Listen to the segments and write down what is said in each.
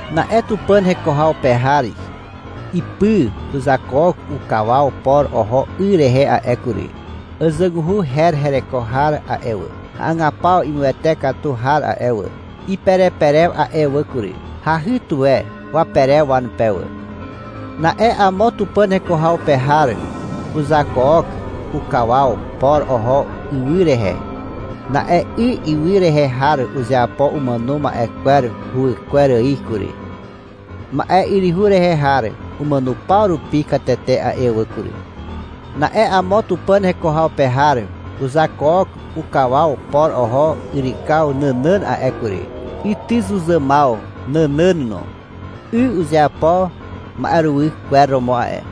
Na'e Tupàn heko haw pe har ipy uzakook ukawaw por oho 'y rehe a'e kury. Àzàguhu her hereko har a'e wà, hagapaw imuwete katu har a'e wà, ipereperew a'e wà kury. Hahy tuwe waperew wanupe wà. Na'e amo Tupàn heko haw pe har uzakook ukawaw por oho ywy rehe. Na'e 'y ywy rehe har uzeapo umàno ma'e kwer huwykwer ài kury. Ma'e yryhu rehe har umàno paw rupi katete a'e wà kury. Na'e amo Tupàn heko haw pe har uzakook ukawaw por oho yrykaw nànàn a'e kury, ytyzuzàmaw nànàn no. 'Y uzeapo ma'eruwy kwer romo a'e.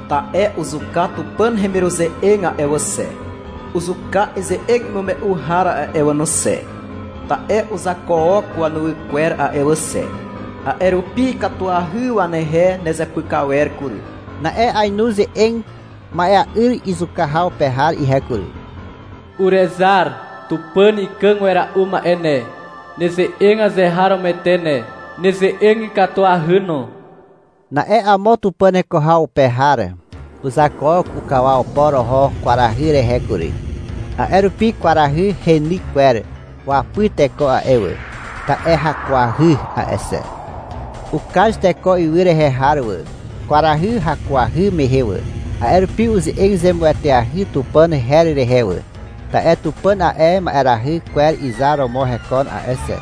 — Ta'e uzuka Tupàn hemiruze'eg a'e wà xe, uzuka ize'eg imume'u har a'e wà no xe, ta'e uzakook wanuwy kwer a'e wà xe. A'e rupi ikatuahy wanehe nezepyk awer kury, i'i izupe. Na'e ainu ze'eg ma'ea'yr zuka haw pe har ihe kury. — Urezar, Tupàn Ikàg Wera'u Ma'e ne. Neze'eg azeharomoete ne. Neze'eg ikatuahy no, i'i izupe. Na'e amo Tupàn heko haw pe har uzakook ukawaw por oho kwarahy rehe kury. A'e rupi kwarahy heny kwer wapy teko a'e wà, ta'e hakuahy a'e xe. Ukaz teko ywy rehe har wà, kwarahy hakuahy mehe wà. A'e rupi uze'eg zemueteahy Tupàn her rehe wà, ta'e Tupàn a'e ma'erahy kwer izar romo hekon a'e xe.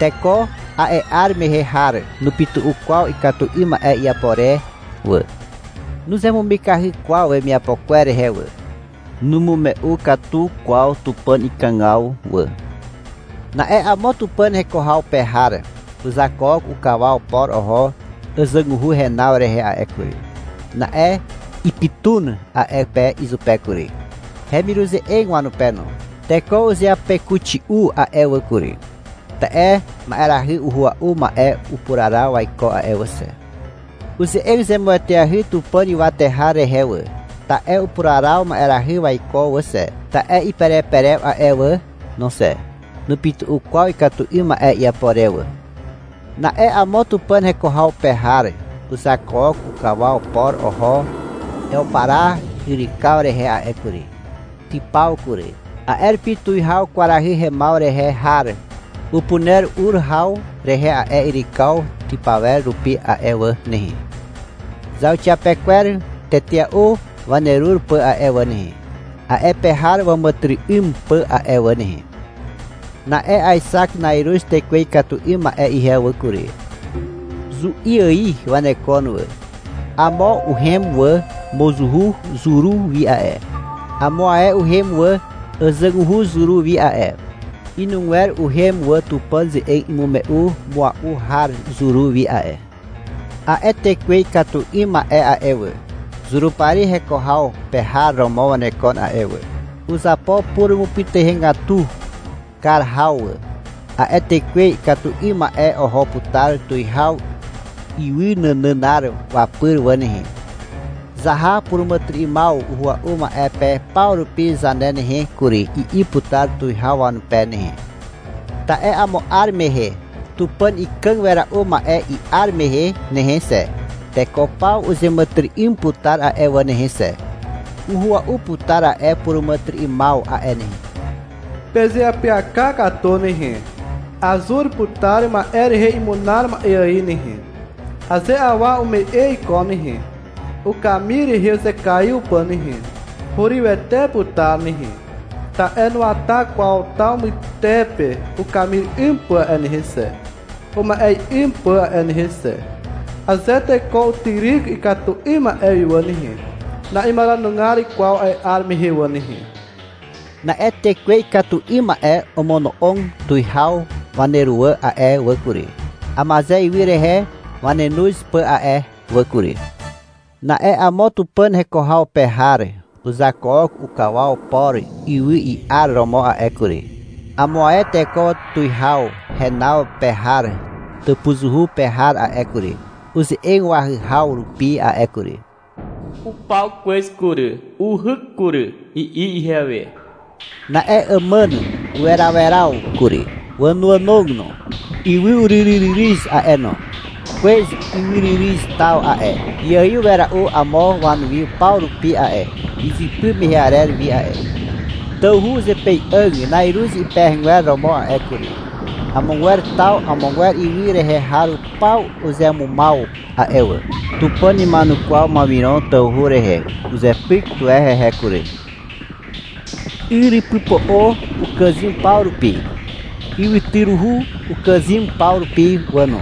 Teko a'e 'ar mehe har nupytu'u kwaw ikatu 'ym ma'e iapo re wà. Nuzemumikahy kwaw wemiapo kwer rehe wà. Numume'u katu kwaw Tupàn ikàgaw wà. Na'e amo Tupàn heko haw pe har uzakook ukawaw por oho àzàguhu henaw rehe a'e kury. Na'e ipytun a'e pe izupe kury, hemiruze'eg wanupe no. Teko uzeapekuxi'u a'e wà kury, ta'e ma'erahy uhua'u ma'e upuraraw waiko a'e wà xe. Uze'eg zemueteahy Tupàn ywate har rehe wà, ta'e upuraraw ma'erahy waiko wà xe, ta'e ipereperew a'e wà no xe. Nupytu'u kwaw ikatu 'ym ma'e iapo re wà. Na'e amo Tupàn heko haw pe har uzakook ukawaw por oho Ewpara yrykaw rehe a'e kury. Typaw kury. A'e rupi tuwihaw kwarahy hemaw rehe har upuner ur haw rehe a'e yrykaw typawer rupi a'e wà nehe, zauxiapekwer tetea'u wanerur pà a'e wà nehe, a'e pe har wàmàtyry'ym pà a'e wà nehe. Na'e aexak na'iruz tekwe ikatu 'ym ma'e ihe wà kury. Zu'i ài wanekon wà. Amo uhem wà mozuhu zuru wi a'e. Amo ae uhem wà àzàguhu zuru wi a'e. Inugwer uhem wà Tupàn ze'eg imume'u mua'u har zuru wi a'e. A'e tekwe ikatu 'ym ma'e a'e wà, Zurupari heko haw pe har romo wanekon a'e wà. Uzapo purumupytuhegatu kar haw wà. A'e tekwe ikatu 'ym ma'e oho putar tuwihaw ywy nànànar wapyr wà nehe. — Zaha puràmàtyry'ymaw uhua'u ma'e pe paw rupi zane nehe kury, i'i putar tuwihaw wanupe nehe. Ta'e amo 'ar mehe Tupàn Ikàg Wera'u Ma'e i'ar mehe nehe xe, teko paw uzeàmàtyry'ym putar a'e wà nehe xe. (Uhua'u putar a'e puràmàtyry'ymaw a'e nehe.) — Pezeapyaka katu nehe. Azur putar ma'e rehe imunar ma'e ài nehe. Aze awa ume'e iko nehe, ukamir rehe uzekaiw pà nehe, hurywete putar nehe, ta'e nuwata kwaw taw mytepe ukamir 'ym pà a'e nehe xe, uma'e 'ym pà a'e nehe xe. (Aze teko utyryk ikatu 'ym ma'e wi wà nehe, na'imaranugar kwaw a'e 'ar mehe wà nehe.) Na'e tekwe ikatu 'ym ma'e omono'og tuwihaw waneruwà a'e wà kury, Amaze ywy rehe wanenoz pà a'e wà kury. Na'e amo Tupàn heko haw pe har uzakook ukawaw por ywy i'ar romo a'e kury. Amo ae teko tuwihaw henaw pe har tàpuzuhu pe har a'e kury, uze'eg wahyhaw rupi a'e kury. — Upaw kwez kury, uhyk kury, i'i ihewe. Na'e àmàn uweraweraw kury, wànoànog no. Ywy uryryryryz a'e no. Kwez ywyryryz taw a'e, iaiw wera'u amo wanuwi paw rupi a'e, izypy mehe arer wi a'e. Tawhu uzepei'àg na'iruz ipehegwer romo a'e kury. Amogwer taw amogwer ywy rehe har paw uzemumaw a'e wà. Tupàn ima'enukwaw Mawiron tawhu rehe. Uzepyk tuwe hehe kury. Yrypypo'o ukàzym paw rupi. Ywytyruhu ukàzym paw rupi wà no.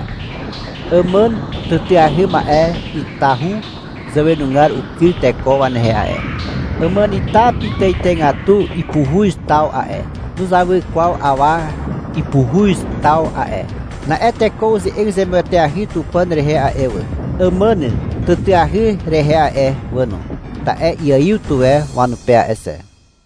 Àmàn tàtàahy ma'e itahu zàwenugar ukyr teko wanehe a'e. Àmànita pitàitàigatu ipuhuz taw a'e, nuzawy kwaw awa ipuhuz taw a'e. Na'e teko uze'eg zemueteahy Tupàn rehe a'e wà, àmàn tàtàahy rehe a'e wà no, ta'e iaiw tuwe wanupe a'e xe.